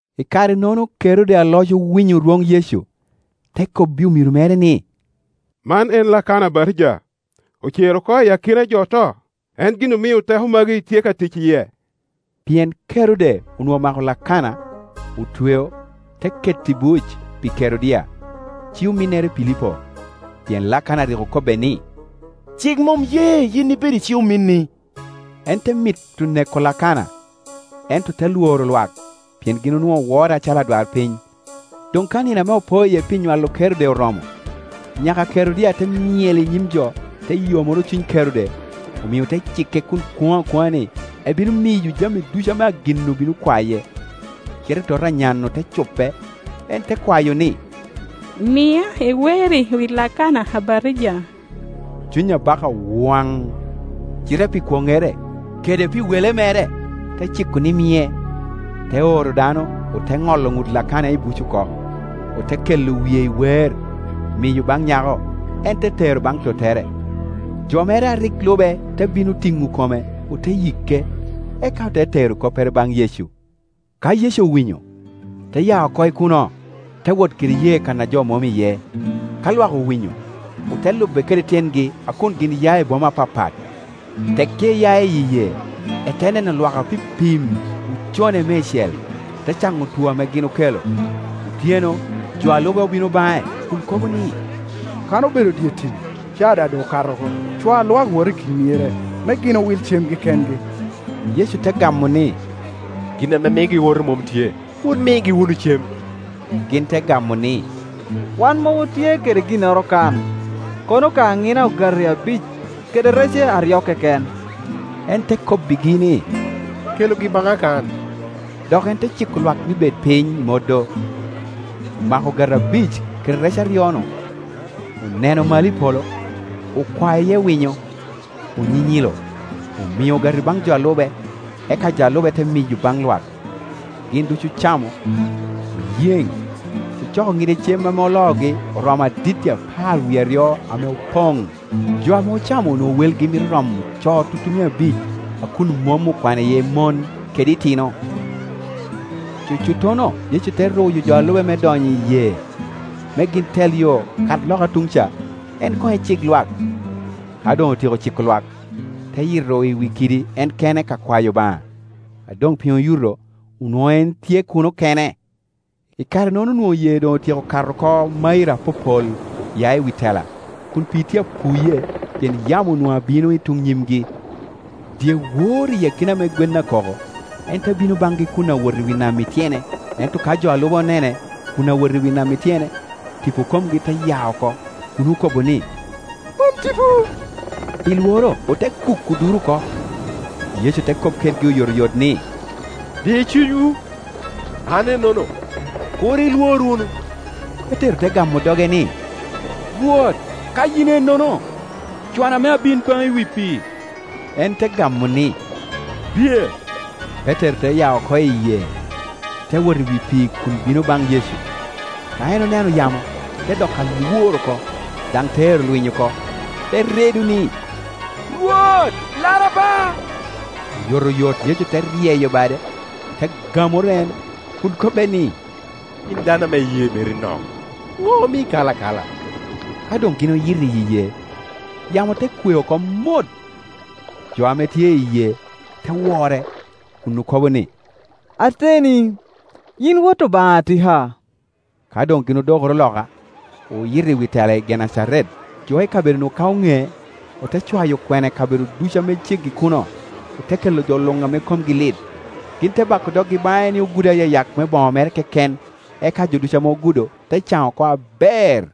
I kare-nono Kerode aloc owinyo dwon Yecu; te kobbi omiro mere ni, “Man en Lakana Abatija. Ocere oko i akina jo oto, en gin omio teko magi tye ka tic i yie.” Pien Kerode onwoŋo omako Lakana, otweo, te keto i buc pi Kerodia, ci-ominnere Pilipo; pien Lakana rik okobbe ni, “Cik mom ye yin ibed i ci-ominni.” En te mito neko Lakana, ento te lworo lwak, pien gin onwoŋo wore acalo adwarpiny. Doŋ ka nino ame opo iye pi nywalo Kerode oromo, nyaka a Kerodia te myel i nyim jo, te yomoro cuny Kerode; omio te cikke kun kwoŋo akwoŋa ni, ebino miyo jami ducu ame agin-nu bino kwaye. Cite tota a nyan-nu te cupe, en te kwayo ni, “Mia i weer-ri wi Lakana Abatija.” Cuny abaka owaŋ, cite pi kwoŋŋere, kede pi Lakana wele mere, te ciko ni mie; te oro dano, ote ŋolo ŋut Lakana i buc oko, ote kelo wie i weer, miyo baŋ nyako, en te tero baŋ tottere. Jo mere a rik lube te bino tiŋo kome, ote yike; eka ote tero koppere baŋ Yecu. Ka Yecu owinyo, te ya oko i kuno, te wot kede yee kan a jo mom iye; ka lwak owinyo, ote lube kede tyengi a kun gin ya i boma apapat. Tekki eya i yee, ete neno lwak apipim; ocone meicel, te caŋo otwo ame gin okelo. Otyeno jo a lube obino baŋe kun kobo ni, “Kan obedo i dye tim; caa daŋ okato oko, cwa lwak wot i akina myere, me gin will cemgi kengi.” Yecu te gamo ni, “Gin ame miogi owoto mom tye. Wun migi wunu cem.” Gin te gamo ni, “Wan mom otye kede ginnoro kan, kono ka aŋina ogati abic kede rece aryo keken.” En te kobbegi ni, “Kelugi baŋa kan.” Dok en te ciko lwak ni bed piny i modo; omako ogati abic kede rec aryo-nu, oneno malo i polo, okwao iye winyo, onyinyilo, omio ogati baŋ jo a lube; eka jo a lube te miyo baŋ lwak. Gin ducu ocamo, oyeŋ. Ocoko ŋide cem ame oloogi, oromo aditti apar wie aryo ame opoŋ. Jo ame ocamo onwoŋo welgi mito romo co tutumia abic, a kun mom okwano iye mon kede itino. Cucuttono Yecu te ruyo jo a lube me donyo i yee, me gin tel yo, kat loka tuŋ ca, en koŋ ecik lwak. Ka doŋ otyeko ciko lwak, te yito i wi kidi en kene ka kwayo Obaŋa. A doŋ piny oyuto, onwoŋo en tye kuno kene. I kare-nono onwoŋo yee doŋ otyeko kato oko mairo apopol ya i wi tela, kun pii tye apuye, pien yamo onwoŋo abino i tuŋ nyimgi. Dyewor i akina ame gwen akoko, en te bino baŋgi kun awot i wi nam i tyene. Ento ka jo a lube onene kun awot i wi nam i tyene, tipo komgi te ya oko, kun okobo ni, “Man tipo”, pi lworo ote kuko duro oko. Yecu te kop kedgi oyotoyot ni, “Di cunywu, an ennono, kur ilwor wunu.” Petero te gamo doge ni, “Rwot, ka in ennono, cwana me abin baŋi i wi pii.” En te gamo ni, “Biye.” Petero te ya oko i yee, te wot i wi pii kun bino baŋ Yecu. Ka en oneno yamo, te doko alwor oko, daŋ te ero lwiny oko, te redo ni, “Rwot, lara ba.” Oyotoyot Yecu te ryeyo bade, te gamoro en, kun kobbe ni, “Yin dano ame iyee meri nok. Ŋo omii ikalo akala?” Ka doŋ gin oyito iyi yee, yamo te kwe oko mot. Jo ame tye i yee te wore, kun okobo ni, “Ateni, yin Wot Obaŋa atika.” Ka doŋ gin odokoro loka, oyito i wi tela i Genecaret. Jo i kabedo-nu ka oŋee, ote cwayo kwena i kabedo ducu ame ceggi i kuno, ote kelo jo luŋ ame komgi lit. Gin te bako doggi baŋe ni ogud ayayak me boŋo mere keken, eka jo ducu ame ogudo te caŋ oko aber.